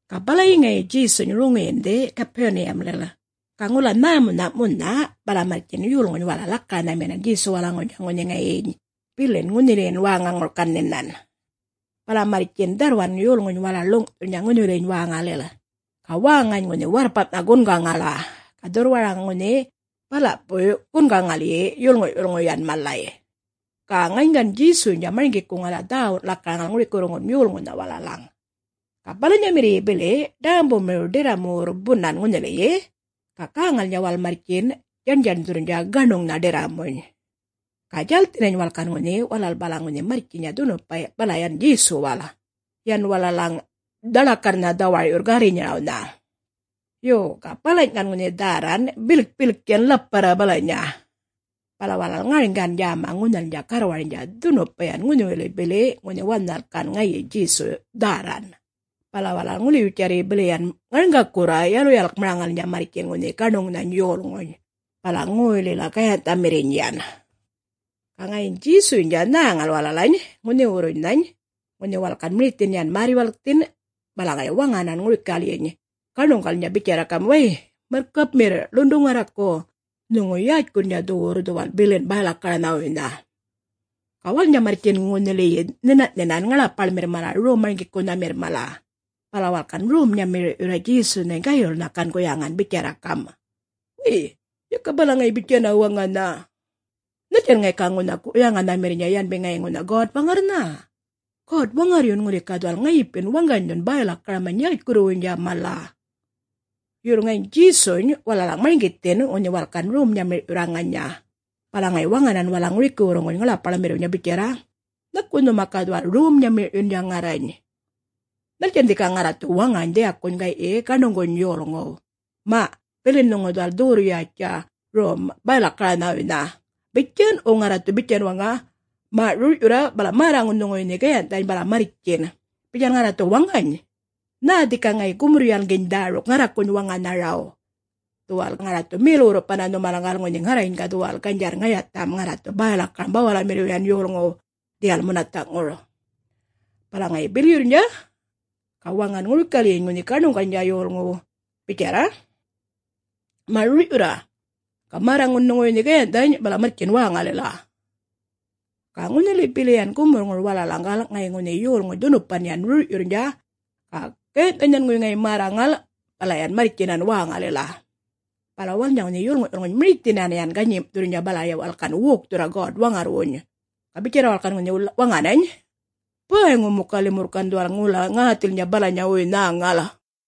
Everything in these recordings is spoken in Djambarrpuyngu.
Ga balayi ŋayi Djesuny roŋiyindhi Gapuniyamlil, ga ŋula nhämunha' munha, bala marrtjin yolŋuny walal lakaranhaminan Djesuwalaŋuwuynydja ŋunhi ŋayiny bilin ŋunhiliyin wäŋaŋura gan nhinan. Bala marrtjin ŋunhi dharrwan yolŋuny mala ḻuŋ'thurrnydja ŋunhiwiliny wäŋalil, ga wäŋany ŋunhi warrpam'nha gungaŋala, ga dhurrwara ŋunhi bala'puy gungaŋalyi yolŋu'-yulŋuy yan malay. Ga ŋayiny gan Djesuynydja marŋgikuŋala dhäwun lakaraŋal ŋurikiwurruŋgun yolŋuwnha walalaŋ. Ga balanyamirriyyi bili ḏämbumiriw ḏirramuwurr bunan ŋunhiliyi, ga gäŋalnydja walal marrtjin ŋunhi djaṉdjaṉdhurrnydja gaṉuŋnha ḏirramuny. Ga djälthinany walal gan ŋunhi, walal balaŋ ŋunhi marrtjinya dhunupa bala yan Djesuwal, yan walalaŋ dhaḻakarrnha dhawar'yurr gärrinyarawnydja. Yo, ga balany' gan ŋunhi dhärran bilkpilk yan ḻaparra balanya, bala walal ŋarŋgan djäma ŋunhalnydja garrwarnydja dhunupa yan ŋunhiwili bili ŋunhi wanhal gan ŋayi Djesu dhärran. Bala walal ŋuliwitjarra bili yan ŋarŋgakurra yaluyalkmaraŋalnydja marrtjin ŋunhi gaṉuŋnhany yolŋuny balan ŋoylila gayanh'thamirriny yan. Ga ŋayiny Djesuynydja nhäŋal walalany ŋunhiwurrunhany ŋunhi walal gan mirithin yan märr-yuwalkthin, bala ŋayi waŋanan ŋurikalyiny gaṉuŋgalnydja bitjarra gam', “Way, marrkapmirr ḻundu ŋarraku, Nhuŋu yätjkurrnydja dhuwurr dhuwal bilin bäy-lakaranhawuynha.” Ga walalnydja marrtjin ŋunhiliyi nhina'-nhinan ŋaḻapaḻmirr mala Rom-marŋgikunhamirr mala, bala walal gan rom-nyamir'yurra Djesunhany, gayulnha gan guyaŋan bitjarra gam', “Way. Yaka balaŋ ŋayi bitjana waŋanha. Nhaltjan ŋayi ga ŋunha guyaŋanhamirnydja yanbi ŋayi ŋunha God-Waŋarrnha? God-Waŋarryun ŋuli ga dhuwal ŋayipin waŋganydhun bäy-lakaramany yätjkurruwuynydja mala.” Yurr ŋayiny Djesuny walalaŋ marŋgithin ŋunhi walal gan rom-nyamir'yurr ŋanya, bala ŋayi waŋanan walalaŋ ŋurikiwurruŋguny ŋaḻapaḻmirriwnydja bitjarra, “Nhaku nhuma ga dhuwal rom-nyamir'yundja ŋarrany? Nhaltjan dhika ŋarra dhu waŋany nhanŋu dhiyakuny gay'yi gaṉuŋguny yolŋuw, ‘Ma, bilin nhuŋu dhuwal dhuwurr-yätjtja rom bäy-lakaranhawuynha’, bitjan, wo ŋarra dhu bitjan gam' waŋa, ‘Ma, rur'yurra bala märraŋun nhuŋuwuy nhe gayanh'thany bala marrtjin’, bitjan ŋarra dhu waŋany? Nhä dhika ŋayi gumurr-yalŋginy dhäruk ŋarrakuny waŋanharaw? Dhuwal ŋarra dhu mel-wurrupanna nhumalaŋgal ŋunhi ŋarrany ga dhuwal ganydjarr ŋayatham ŋarra dhu bäy-lakaram bawalamirriw yan yolŋuw dhiyal munatha'ŋur.” Bala ŋayi bilyurrnydja, ga waŋan ŋurikalyiny ŋunhi gaṉuŋguny yolŋuw bitjarra, “Ma', rur'yurra, ga märraŋun nhuŋuwuy nhe gayanh'thany, bala marrtjin wäŋalila.” Ga ŋunhili bili yan gumurrŋur walalaŋgal, ŋayi ŋunhi yolŋuny dhunupan yan rur'yurrnydja, ga gayanh'thany nhanŋuwuy ŋayi märraŋal, bala yan marrtjinan wäŋalila. Bala walalnydja ŋunhi yolŋu'-yulŋuny mirithinan yan ganyim'thurrnydja, bala yan walal wokthurra God-Waŋarrwuny, ga bitjarra walal gan ŋunhi waŋanany, “Bäyŋu muka limurr gan dhuwal ŋula ŋäthilnydja balanyawuy nhäŋal.”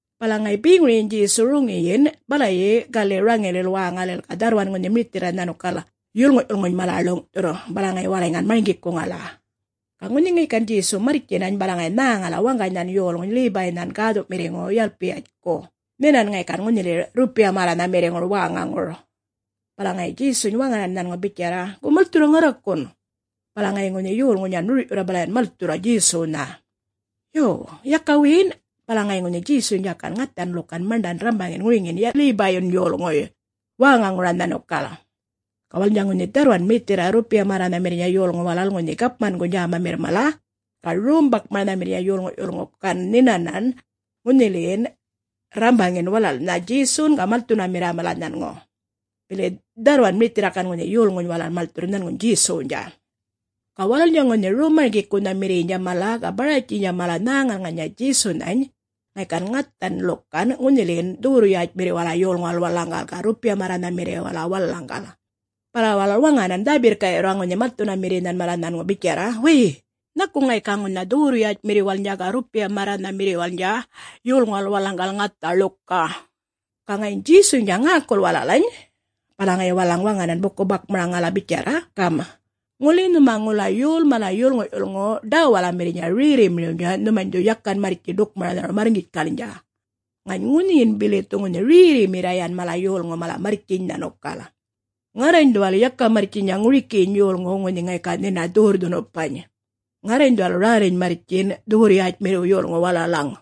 Bala ŋayi beŋuryiny Djesu roŋiyin balayi gali' raŋilil wäŋalil, ga dharrwan ŋunhi mirithirra nhanukal yolŋu'-yulŋuny mala ḻuŋ'thurr, bala ŋayi walalany gan marŋgikuŋala. Ga ŋunhi ŋayi gan Djesu marrtjinany, bala ŋayi nhäŋala waŋganynhan yolŋuny Lebaynha gäthu'mirriŋu Yalpayatjku, nhinan ŋayi gan ŋunhiliyi rrupiya märranhamirriŋur wäŋaŋur. Bala ŋayi Djesuny waŋanan nhanŋu bitjarra, “Go malthurra ŋarrakun.” Bala ŋayi ŋunhi yolŋuny yan rur'yurra, bala yan malthurra Djesuwnha. Yo. Yaka wiyin, bala ŋayi ŋunhi Djesuynydja gan ŋathan ḻukan maṉḏan rrambaŋin ŋuriŋiyin Lebayyun yolŋuy wäŋaŋura nhanukal. Ga walalnydja ŋunhi dharrwan mirithirra rrupiya-märranhamirrnydja yolŋu walal ŋunhi gapmanguny djämamirr mala, ga rom-bakmaranhamirrnydja yolŋu'-yulŋu gan nhina'-nhinan ŋunhiliyin rrambaŋin walalnha Djesun ga malthunamirra mala nhanŋu. Bili dharrwan mirithirra gan ŋunhi yolŋuny walal malthurr nhanŋuny Djesuwnydja. Ga walalnydja ŋunhi Rom-marŋgikunhamirriynydja mala ga Baratjiynydja mala nhäŋal ŋanya Djesunhany ŋayi gan ŋathan ḻukan ŋunhiliyin dhuwurr-yätjmirriwala yolŋuwal walalaŋgal, ga rrupiya-märranhamirriwala walalaŋgal. Bala walal waŋanan dhä-birrka'yurra ŋunhi malthunamirrinhan mala nhanŋu bitjarra, “Wäy, nhaku ŋayi ga ŋunha dhuwurr-yätjmirriwalnydja ga rrupiya-märranhamirriwalnydja yolŋuwal walalaŋgal ŋatha ḻuka?” Ga ŋayiny Djesuynydja ŋäkul walalany, bala ŋayi walalaŋ waŋanan buku-bakmaraŋalnydja bitjarra gam', “Ŋuli nhuma ŋula yol mala yolŋu'-yulŋu ḏäwalamirrnydja rerrimiriwnydja, nhumany dhu yakan marrtji ḏukmaranharaw marrŋgitjkalnydja, ŋany ŋunhiyin bili dhu ŋunhi rerrimirra yan mala yolŋu walal marrtjiny nhanukal. Ŋarrany dhuwal yaka marrtjinya ŋurikiyiny yolŋuw ŋunhi ŋayi ga nhina dhuwurr-dhunupany; ŋarrany dhuwal räliny marrtjin dhuwurr-yätjmirriw yolŋuw walalaŋ.”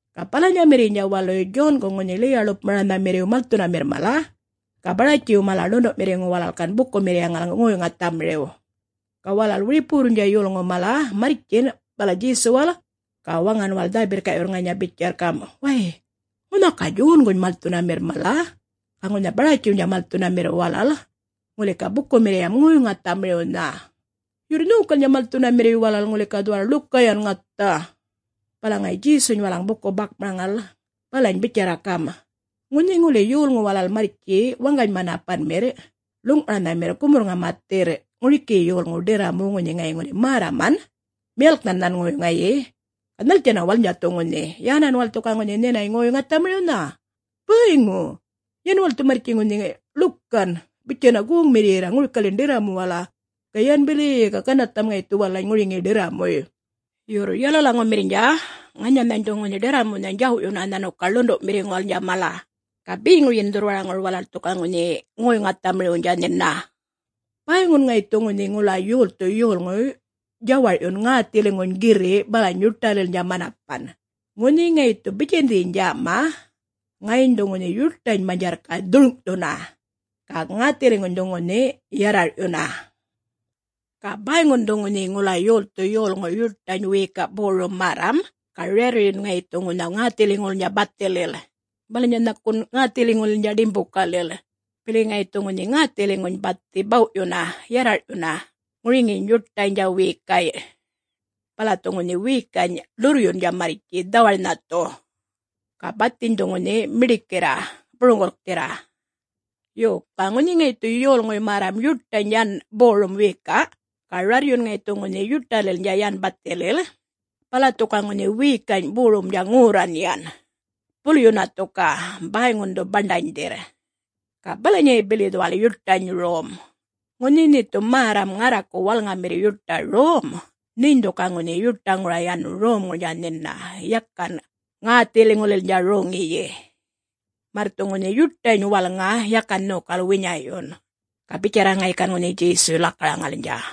Ga balanyamirriynydja waluy Djongu ŋunhi ḻiya-ḻupmaranhamirriw malthunamirr mala, ga Baratjiw mala ḻundu'mirriŋu walal gan bukumirriyaŋal ŋoy-ŋathamiriw. Ga walal wiripuwurrnydja yolŋu mala marrtjin bala Djesuwal, ga waŋan walal dhä-birrka'yurr ŋanya bitjarr gam', “Way, ŋunha ga Djonguny malthunamirr mala, ga ŋunha Baratjiwnydja malthunamirr walal ŋuli ga bukumirriyam ŋoy-ŋathamiriwnha. Yurr nhokalnydja malthunamirriy walal ŋuli ga dhuwal ḻuka yan ŋatha.” Bala ŋayi Djesuny walalaŋ buku-bakmaraŋal balany bitjarra gam', “Ŋunhi ŋuli yolŋu walal marrtji waŋgany-manapanmirr ḻuŋ'maranhamirr gumurr-ŋamathirr ŋurikiyi yolŋuw ḏirramuw ŋunhi ŋayi ŋuli märraman miyalknhan nhanŋuwuy ŋayi, ga nhaltjanna walalnydja dhu ŋunhi? … yänan walal ŋuli ga ŋunhi nhinany ŋoy-ŋathamiriwnha? Bäyŋu, yan walal dhu marrtji ŋunhi ḻukan bitjanna goŋmirriyirra ŋurikalyin ḏirramuwala, ga yan bili-i-i, ga ganarrtham ŋayi dhu walalany ŋuriŋiyi ḏirramuy. Yurr yalalaŋumirrnydja ŋanyanhany dhu ŋunhi ḏirramunhany djaw'yunna nhanukal ḻundu'mirriŋuwalnydja mala, ga beŋuryin dhurrwaraŋur walal dhu ga ŋunhi ŋoy-ŋathamiriwnydja nhina.” “Bäyŋun ŋayi dhu ŋunhi ŋula yolthu yolŋuy djawar'yun ŋäthiliŋuny girri' balany yuṯalilnydja manapan, ŋunhi ŋayi dhu bitjandhiny djäma, ŋayiny dhu ŋunhi yuṯany manydjarrka' dhurŋ'thuna, ga ŋäthiliŋuny dhu ŋunhi yarrar'yuna.” “Ga bäyŋun dhu ŋunhi ŋula yolthu yolŋuy yuṯany wiyika' borum märram ga rarryun ŋayi dhu ŋunha ŋäthiliŋulilnydja bathilil, balanya nhakun ŋäthiliŋulilnydja ḏimbukalil, bili ŋayi dhu ŋunhi ŋäthiliŋuny bathi baw'yunna yarrar'yunna ŋuriŋiyiny yuṯaynydja wiyikay', bala dhu ŋunhi wiyikany' ḻurryundja marrtji dhawar'nha dhu, ga bathiny dhu ŋunhi miḏikirra buruŋgulkthirra. Yo, ga ŋunhi ŋayi dhu yolŋuy märram yuṯany yan borum wiyika', ga rarryun ŋayi dhu ŋunhi yuṯalilnydja yan bathilil, bala dhu ga ŋunhi wiyikany' borumdja ŋorran yan, bulyunna dhu ga, bäyŋun dhu baṉḏanydhirr. Ga balanyayi bili dhuwal yuṯany rom. Ŋunhi nhe dhu märram ŋarraku walŋamirr yuṯa rom, nheny dhu ga ŋunhi yuṯaŋura yan romŋurnydja nhina, yakan ŋäthiliŋulilnydja roŋiyi, märr dhu ŋunhi yuṯany walŋa yakan nhokal winya'yun.” Ga bitjarra ŋayi gan Djesuy lakaraŋalnydja.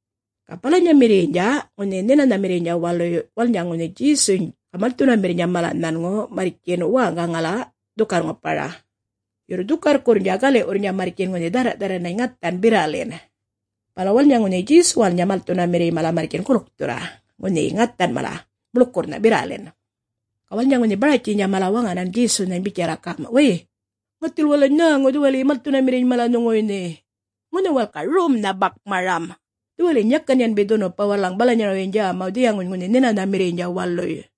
Ga balanyamirriynydja ŋunhi Nhinanhamirriynydja waluy walalnydja ŋunhi Djesuny ga malthunamirrnydja mala nhanŋu marrtji wäŋgaman dhukarr-ŋupanna, yurr dhukarrkurrnydja gali'wurrnydja marrtjin ŋunhi dhärra'-dharran ŋathan birralin. Bala walalnydja ŋunhi Djesuwalnydja malthunamirriy mala marrtjin gulk-gulkthurra ŋunhi ŋathan mala muḻkurrnha birralin. Ga walalnydja ŋunhi Baratjiynydja mala waŋanan Djesunhany bitjarra gam', “Way, ŋathil walalany nhäŋu dhuwaliyi malthunamirriny mala nhuŋuwuy nhe. Ŋunha walal ga romnha bakmaram. Dhuwaliyiny yakan yanbi dhunupa walalaŋ balanyarawyiny djämaw dhiyaŋuny ŋunhi Nhinanhamirriynydja waluy.”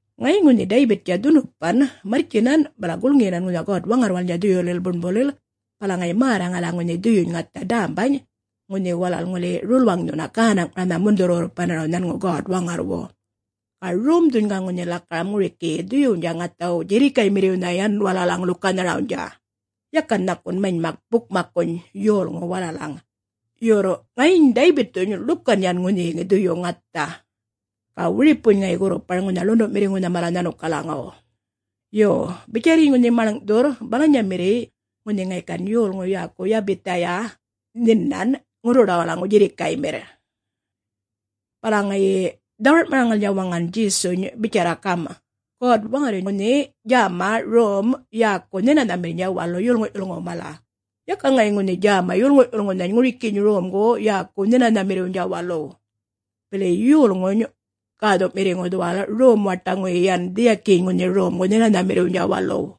Ŋayiny ŋunhi Daybittja dhunupan marrtjinan, bala gulŋiyinan ŋunhi God-Waŋarrwalnydja dhuyulil buṉbulil, bala ŋayi märraŋala ŋunhi dhuyuny ŋatha dämbany ŋunhi walal ŋuli rulwaŋdhunna gänaŋ'maranha mundhurr-wurrupanaraw nhanŋu God-Waŋarrwu. Ga romdhuny ga ŋunhi lakaram ŋurikiyi dhuyuwnydja ŋathaw djirrikaymirriwnha yan walalaŋ ḻukanharawnydja, yakan nhakun manymak bukmakkuny yolŋuw walalaŋ. Yurr ŋayiny Daybitthuny ḻukan yan ŋunhiyi dhuyu ŋatha, ga wiripuny ŋayi gurrupar ŋunha ḻundu'mirriŋuwnha mala nhanukalaŋaw. Yo, bitjarryiny ŋunhi maḻŋ'thurr balanyamirriy ŋunhi ŋayi gan yolŋu yäku Yabiyatha yan nhinan ŋurruḏawalaŋu djirrikaymirrnydja.” Bala ŋayi dhawar'maraŋalnydja waŋan Djesu bitjarra gam', “God-Waŋarryuny ŋunhi djäma rom yäku Nhinanhamirrnydja Walu yolŋu'-yulŋuw mala; yaka ŋayi ŋunhi djäma yolŋu'-yulŋunhany ŋurikiyiny romgu yäkuw Nhinanhamirriwnydja Waluw. Bili Yolŋuny Gäthu'mirriŋu dhuwal rom-waṯaŋuyi yan dhiyakiyiny ŋunhi romgu Nhinanhamirriwnydja Waluw.”